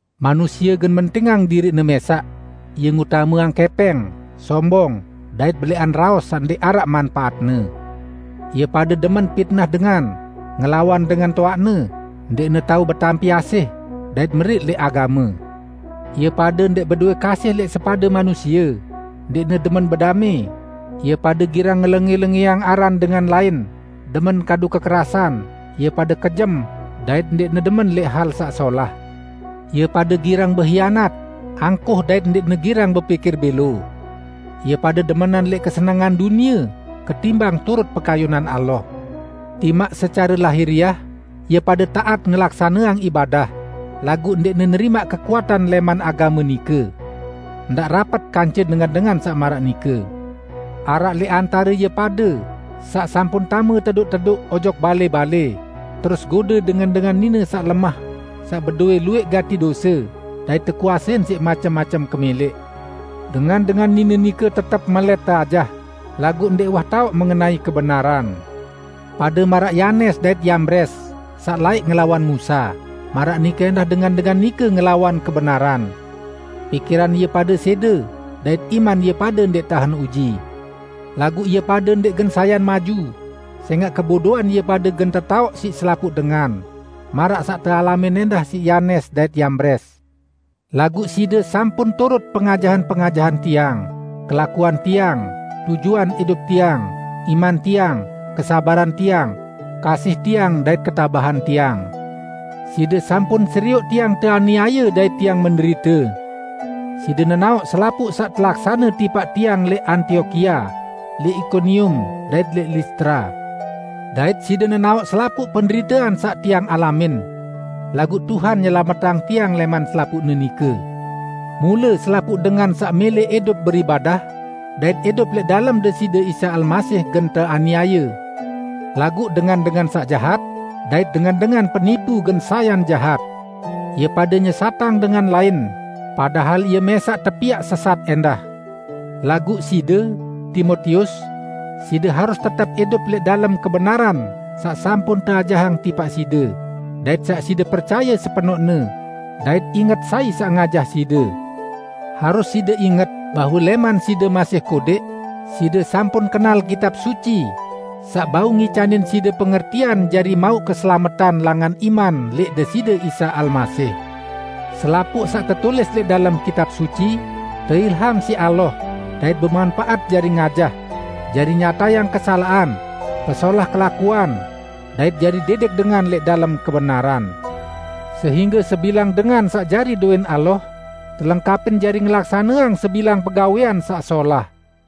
Manusie gen mentingang diriqne mẽsaq, ie ngutameang kẽpẽng, sombong dait belẽqan raos saq ndẽq araq manpaatne. Ie pade demen pitnah dengan, ngelawan dengan toaqne, ndẽqne tao betampi asih, dait meriq lẽq agame. Ie pade ndẽq bedowẽ kasih lẽq sepade manusie, ndẽqne demen bedamẽ, ie pade girang ngelengẽ-lengẽang aran dengan lain, demen kadu kekerasan, ie pade kejem dait ndẽqne demen lẽq hal saq solah. Ie pade girang behianat, angkuh dait ndẽqne girang bepikir bẽlo. Ie pade demenan lẽq kesenengan dunie ketimbang turut pekayunan Allah. Timaq secare lahiriah, ie pade taat ngelaksaneang ibadah, laguq ndẽqne nerimaq kekuatan lẽman agame nike. Ndaq rapet kance dengan-dengan saq maraq nike. Araq lẽq antare ie pade saq sampun tame tedoq-tedoq ojok balẽ-balẽ, terus gode dengan-dengan nine saq lemah saq bedowẽ luwẽq gati dose dait tekuasein siq macem-macem kemẽlẽq. Dengan-dengan nine nike tetep melẽt teajah, laguq ndẽq uwah taoq mengenai kebenaran. Pade maraq Yanes dait Yambres saq laẽq ngelawan Musa, maraq nike ẽndah dengan-dengan nike ngelawan kebenaran. Pikiran ie pade sẽde, dait iman ie pade ndẽq tahen uji. Laguq ie pade ndẽq gen sayan maju, sẽngaq kebodoan ie pade gen tetaoq siq selapuq dengan, maraq saq tealamin ẽndah siq Yanes dait Yambres. Laguq side sampun turut pengajahan-pengajahan tiang, kelakuan tiang, tujuan idup tiang, iman tiang, kesabaran tiang, kasih tiang dait ketabahan tiang. Side sampun serioq tiang teaniaye dait tiang menderite. Side nenaoq selapuq saq telaksane tipaq tiang lẽq Antiokia, lẽq Ikonium, dait lẽq Listra; dait side nenaoq selapuq penderitean saq tiang alamin! Laguq Tuhan nyelametang tiang lẽman selapuqne nike. Mule selapuq dengan saq mẽlẽ idup beribadah dait idup lẽq dalem Deside Isa Almasih gen teaniaye, laguq dengan-dengan saq jahat dait dengan-dengan penipu gen sayan jahat. Ie pade nyesatang dengan lain, padahal ie mẽsaq tepiaq sesat ẽndah. Laguq side, Timotius, side harus tetep idup lẽq dalem kebenaran saq sampun teajahang tipaq side dait saq side percaye sepenoqne, dait inget sai saq ngajah side. Harus side inget bahwe lẽman side masih kodẽq side sampun kenal Kitab Suci saq bau ngicanin side pengertian jari mauq keselametan langan iman lẽq Deside Isa Almasih. Selapuq saq tetulis lẽq dalem Kitab Suci, teilham siq Allah dait bemanpaat jari ngajah, jari nyatayang kesalaqan, pesolah kelakuan, dait jari didik dengan lẽq dalem kebenaran. Sehingge sebilang dengan saq jari dowẽn Allah telengkapin jari ngelaksaneang sebilang pegawẽan saq solah.